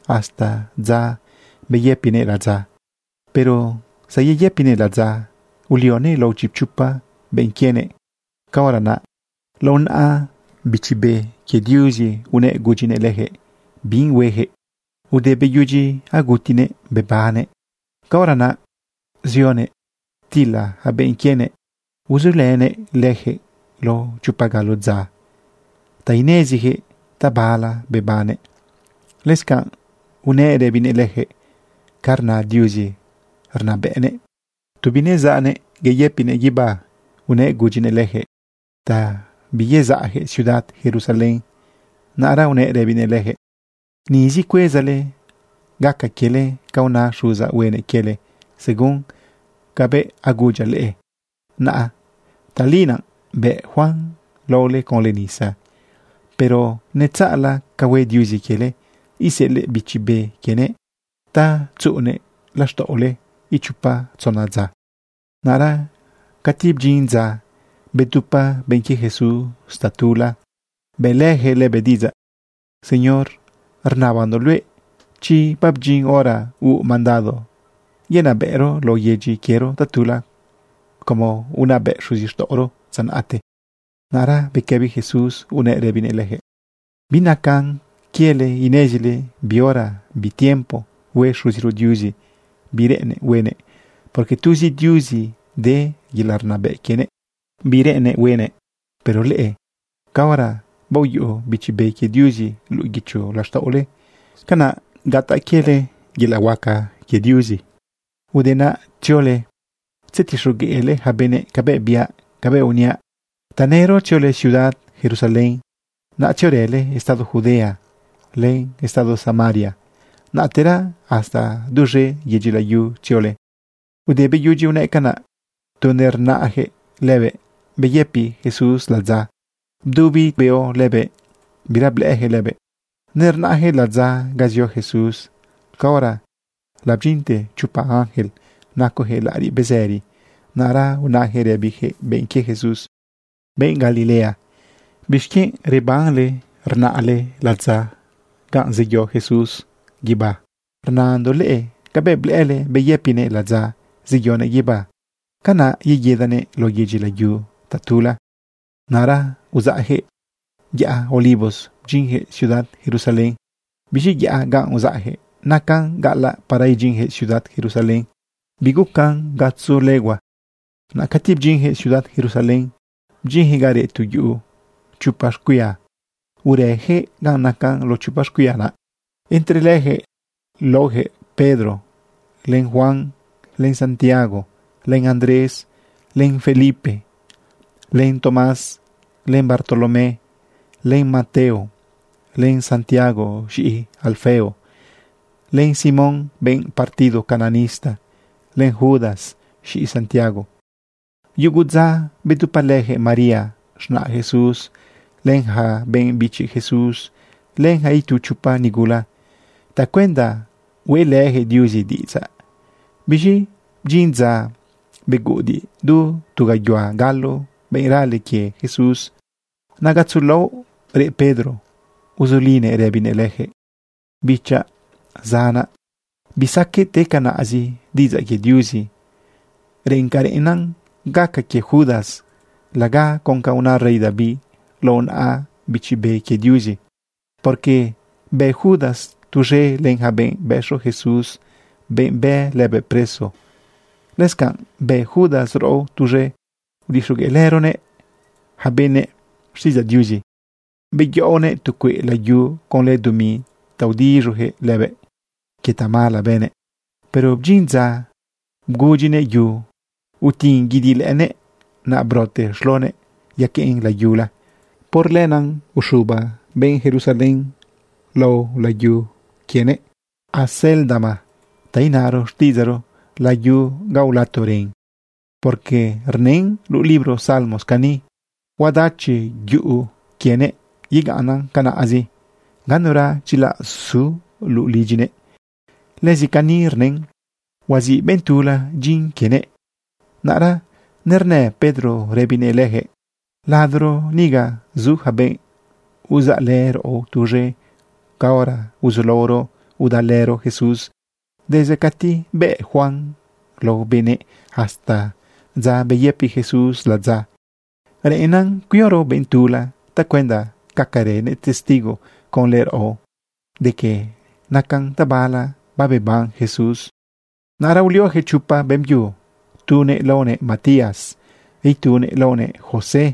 hasta dza beyëpinëꞌ ladza. Pero zayeyëpinëꞌ ladza, ulionëꞌ lao chipchopa benꞌ quienëꞌ. Caora naꞌ lao naꞌa Bichi Be quie Diuzi unëꞌ gudyinëꞌ leyaquëꞌ bi hueyaquëꞌ. Ude beyudyi agutinëꞌ bebannëꞌ, caora naꞌ zionëꞌ ptilëꞌ ja benꞌ quienëꞌ, uzulënëꞌ leyaquëꞌ lao chopa galo dza ta ineziyaquëꞌ tabala bebannëꞌ. Lëscanꞌ unëꞌ rëbinëꞌ leyaquëꞌ ca rna Diuzi rnabëꞌnëꞌ. Tu binezaꞌnëꞌ guibá unëꞌ gudyinëꞌ leyaquëꞌ ta biyezaꞌyaquëꞌ ciudad Jerusalén. Naꞌra unëꞌ rëbinëꞌ leyaquëꞌ: ―Nizi cuezale gaca quiele ca una Xuzaꞌ huenëꞌ quiele según cabëꞌ agudyaꞌ leꞌe. Naꞌ tali naꞌ bëꞌ Juan laole conlë nisa, pero netzaꞌla ca hue Diuzi quiele, iseꞌelëꞌ Bichi Be quienëꞌ ta tzuꞌunëꞌ laxtaꞌole ichopa tzona dza. Naꞌra cati bdyin dza, bedupa benꞌ quie Jesús tatula bëꞌlëjëꞌ lëbëꞌ diꞌidzaꞌ: ―¿Señor, rnabandoꞌ luëꞌ chi babdyin hora huuꞌ mandado yenabëꞌro lao yedyi quiero tatula como unabëꞌ xuzixtaꞌoro dza naꞌte? Naꞌra bequëbi Jesús nëꞌ rëbinëꞌ leyaquëꞌ: ―Binacan quiele inezile bi hora, bi tiempo, hue Xuziro Diuzi bi reꞌennëꞌ huenëꞌ, porque tuzi Diuzi de yelaꞌ rnabëꞌ quienëꞌ bi reꞌennëꞌ huenëꞌ. Pero leꞌe, caora baoyuꞌu Bichi Be quie Diuzi luꞌu guicho laxtaꞌole, canaꞌ gataꞌ quiele yelaꞌ huaca quie Diuzi. Te naꞌ tziole tzetixogueꞌle yaca benëꞌ len cabëꞌ biaꞌ cabëꞌ uniaꞌ. Tanëro tziole ciudad Jerusalén. Naꞌ tziorële estado Judea len estado Samaria. Naꞌtera hasta duz̃e yedyi layu tziole. Ude beyudyi unëꞌ canaꞌ, tu nernaꞌyaquëꞌ lëbëꞌ, beyëpi Jesús ladza, bdubi beo lëbëꞌ, bira blëꞌëyaquëꞌ lëbëꞌ. Nernaꞌyaquëꞌ ladza ga zio Jesús, caora labdyinte chopa ángel nacoyaquëꞌ laꞌariꞌ bezëri. Naꞌra unayaquëꞌ rëbiyaquëꞌ benꞌ quie Jesús: ―¡Benꞌ Galilea! ¿Bixquienꞌ rebanle rnaꞌle ladza ganꞌ zeyo Jesús guibá? Rnandoꞌ leꞌe cabëꞌ blëꞌële beyëpinëꞌ ladza zeyonëꞌ guibá, canaꞌ yeguidanëꞌ lao yedyi layu tatula. Naꞌra uzaꞌyaquëꞌ yaꞌa Olivos bdyinyaquëꞌ ciudad Jerusalén. Biz̃i yaꞌa ga uzaꞌyaquëꞌ nacan gaꞌalaꞌ para idyinjëꞌ ciudad Jerusalén. Bigucan gatzo legua. Naꞌ cati bdyinyaquëꞌ ciudad Jerusalén, bdyinyaquëꞌ ga reꞌ tu yuꞌu chopa xcuia, urëyaquëꞌ ga nacan lao chopa xcuia naꞌ. Entre leyaquëꞌ laojëꞌ Pedro, len Juan, len Santiago, len Andrés, len Felipe, len Tomás, len Bartolomé, len Mateo, len Santiago z̃iꞌi Alfeo, len Simón benꞌ partido cananista, len Judas z̃iꞌi Santiago. Yugu dza bedupalëjëꞌ María, z̃naꞌ Jesús, len yaca benꞌ bichi Jesús, len yaca itu chopa nígula tacuenda hueꞌlëjëꞌ Diuzi diꞌidzaꞌ. Biz̃i bdyin dza beguꞌudiꞌ du tu gayuhua galo benꞌ rale quie Jesús. Naꞌ gatzo laoꞌ reꞌ Pedro uzulinëꞌ rëbinëꞌ leyaquëꞌ: ―Bichaꞌ, zanaꞌ, bisaqueꞌ te canaꞌzi diꞌidzaꞌ quie Diuzi. Reꞌen ca reꞌena gaca quie Judas laga con ca una rey David lao naꞌa Bichi Be quie Diuzi, porque bë Judas tuz̃e len yaca benꞌ bëxo Jesús, benꞌ bë lëbëꞌ preso. Lëscanꞌ bë Judas raꞌo tuz̃e udixogueꞌlëronëꞌ yaca benëꞌ xtiꞌidzaꞌ Diuzi. Beyaꞌonëꞌ tu cueꞌ layu conlë dumi ta udiz̃uyaquëꞌ lëbëꞌ quie tamala bënëꞌ. Pero bdyin dza bgudyinëꞌ yu utin guidi lëꞌënëꞌ, naꞌ brote xlonëꞌ yaqueꞌn layula. Por lenaꞌ uxuba benꞌ Jerusalén lao layu quienëꞌ Acéldama, ta inaro xtiꞌidzaꞌro: Layu ga ulato ren. Porque rnën luꞌu libro Salmos cani: Huadachi yuꞌu quienëꞌ, yegaꞌnnan canaꞌzi. Ganura dyilaꞌ su luꞌu lidyinëꞌ. Lëzi cani rnën: Huaziꞌ benꞌ tula dyin quienëꞌ. Naꞌra nerna Pedro rëbinëꞌ leyaquëꞌ: ―Ladoro niga zu yaca benꞌ uzaꞌlë raꞌo tuz̃e caora uzulaoro udalëro Jesús desde cati bëꞌ Juan lao benëꞌ hasta dza beyëpi Jesús ladza. Reꞌennan cuioro benꞌ tula tacuenda gacarënëꞌ testigo conlë raꞌo de que nacan tabala babeban Jesús. Naꞌra ulioyaquëꞌ chopa beꞌmbyu. Tunëꞌ laonëꞌ Matías, itunëꞌ laonëꞌ José,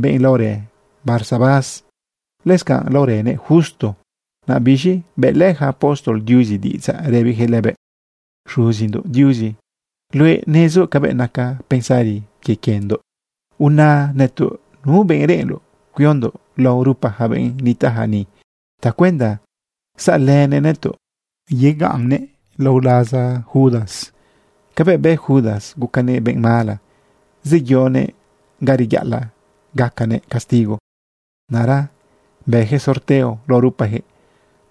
benꞌ laorë Barsabás, lëscanꞌ laorënëꞌ Justo. Naꞌ biz̃i bëꞌlë yaca apóstol Diuzi diꞌidzaꞌ rëbiyaquëꞌ lëbëꞌ: ―Xuzindoꞌ Diuzi, luëꞌ nezoꞌ cabëꞌ naca pensari quie quiendoꞌ. Una nëtoꞌ nu benꞌ reꞌenloꞌ cuiondoꞌ lao rupa yaca benꞌ nitaꞌja ni tacuenda saꞌlënëꞌ nëtoꞌ yegaꞌnnëꞌ lao laza Judas. Cabëꞌ bë Judas, gucanëꞌ benꞌ mala, zeyonëꞌ ga reyaꞌalaꞌ zagacanëꞌ castigo. Naꞌra bëyaquëꞌ sorteo lao rupayaquëꞌ.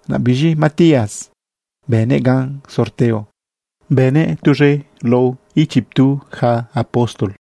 Naꞌ biz̃i Matías bënëꞌ gan sorteo bënëꞌ tuz̃e lao ichiptu ja apóstol.